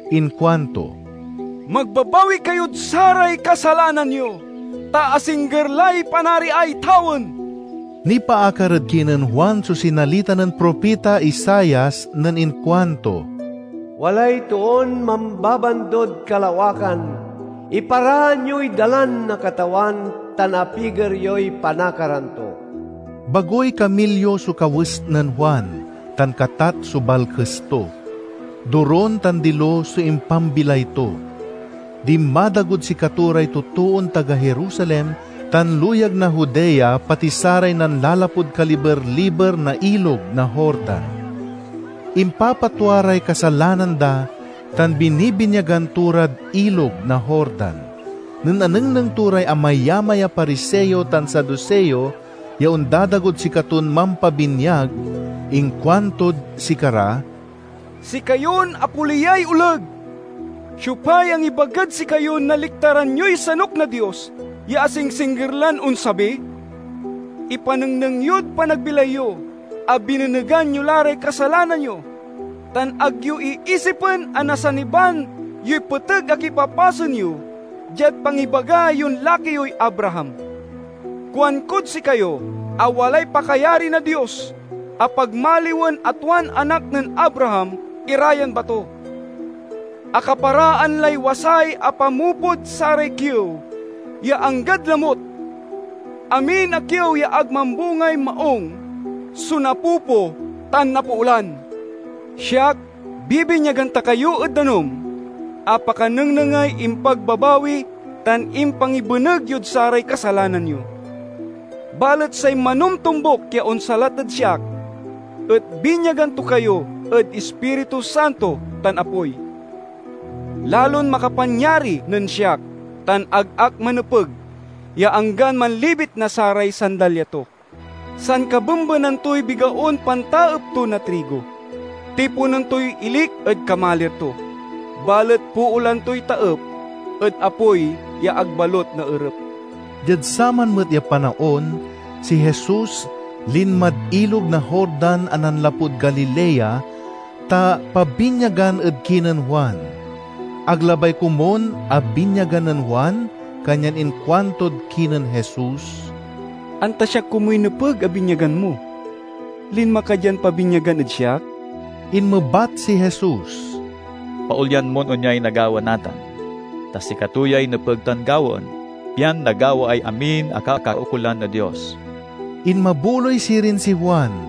Inkuanto, "Magbabawi kayod saray kasalanan yo, ta asingger lay Panariay tawen!" Nipaakar ed kinen Juan so sinalita nen propita Isaias nen inkuanto, "Walay toon mambabandod kalawakan, 'Iparaan yoy dalan na Katawan tan apiger yoy panakaran to!'" Bagoy kamilyo so kawes nen Juan, tan katat so balkes to. Dorun tan dilo so impambilay to. Dinmadagod sikato ray totoon taga Jerusalem tan luyag na Judea, pati saray nanlalapud kaliberliber na Ilog na Jordan. Impapatwa ray kasalanan da, tan binibinyagan to rad Ilog na Jordan. Nen anengneng to ray amayamay a Pariseo tan Saduseo ya ondadagod sikaton mampabinyag, inkuantod sikara, "Sikayon apoliyay oleg! Siopay angibagad sikayon naliktaran yoy sanuk na Dios ya asingsingger lan onsabi? Ipanengneng yod panagbilay yo a binenegan yo la ray kasalanan yo. Tan ag yo iisipen a nasaniban yoy peteg a kipapasen yo diad pangibaga yon laki yoy Abraham. Kuankod sikayo a walay pakayari na Dios a pagmaliwen a tuan anak nen Abraham ira yan bato! Akaparaan lay wasay a pamopod saray kiew ya anggad lamut. Amin a kiew ya ag mambungay maung so napopo tan napoolan. Siak bibinyagan ta kayo ed danum a pakanengnengay impagbabawi tan impangibeneg yod saray kasalanan yo; balet say manomtombuk ya onsalat ed siak et binyagan to kayo ed Ispiritu Santo tan apoy. Lalon makapanyari nen siak tan ag ak manepeg ya anggan manlibit na saray sandalya to. Sankabembenan toy bigaon pantaep to na trigo. Tiponen toy ilik ed kamalir to, balet poolan toy taep ed apoy ya ag balut naerep." Diad saman met a panaon, si Jesus linmad Ilog na Jordan a nanlapud Galilea, ta pabinyagan ed kinen Juan. Ag labay komun a binyagan nen Juan, kanyan inkuantod kinen Jesus, "Anta siak komuy nepeg a binyagan mo, linma ka dian pabinyagan ed siak?" Inmebat si Jesus, "Paolyan mon onyay nagawa natan, ta sikato yay nepeg tan gawaen, pian nagawaay amin a kakaukolan na Dios." Inmabuloy sirin si Juan.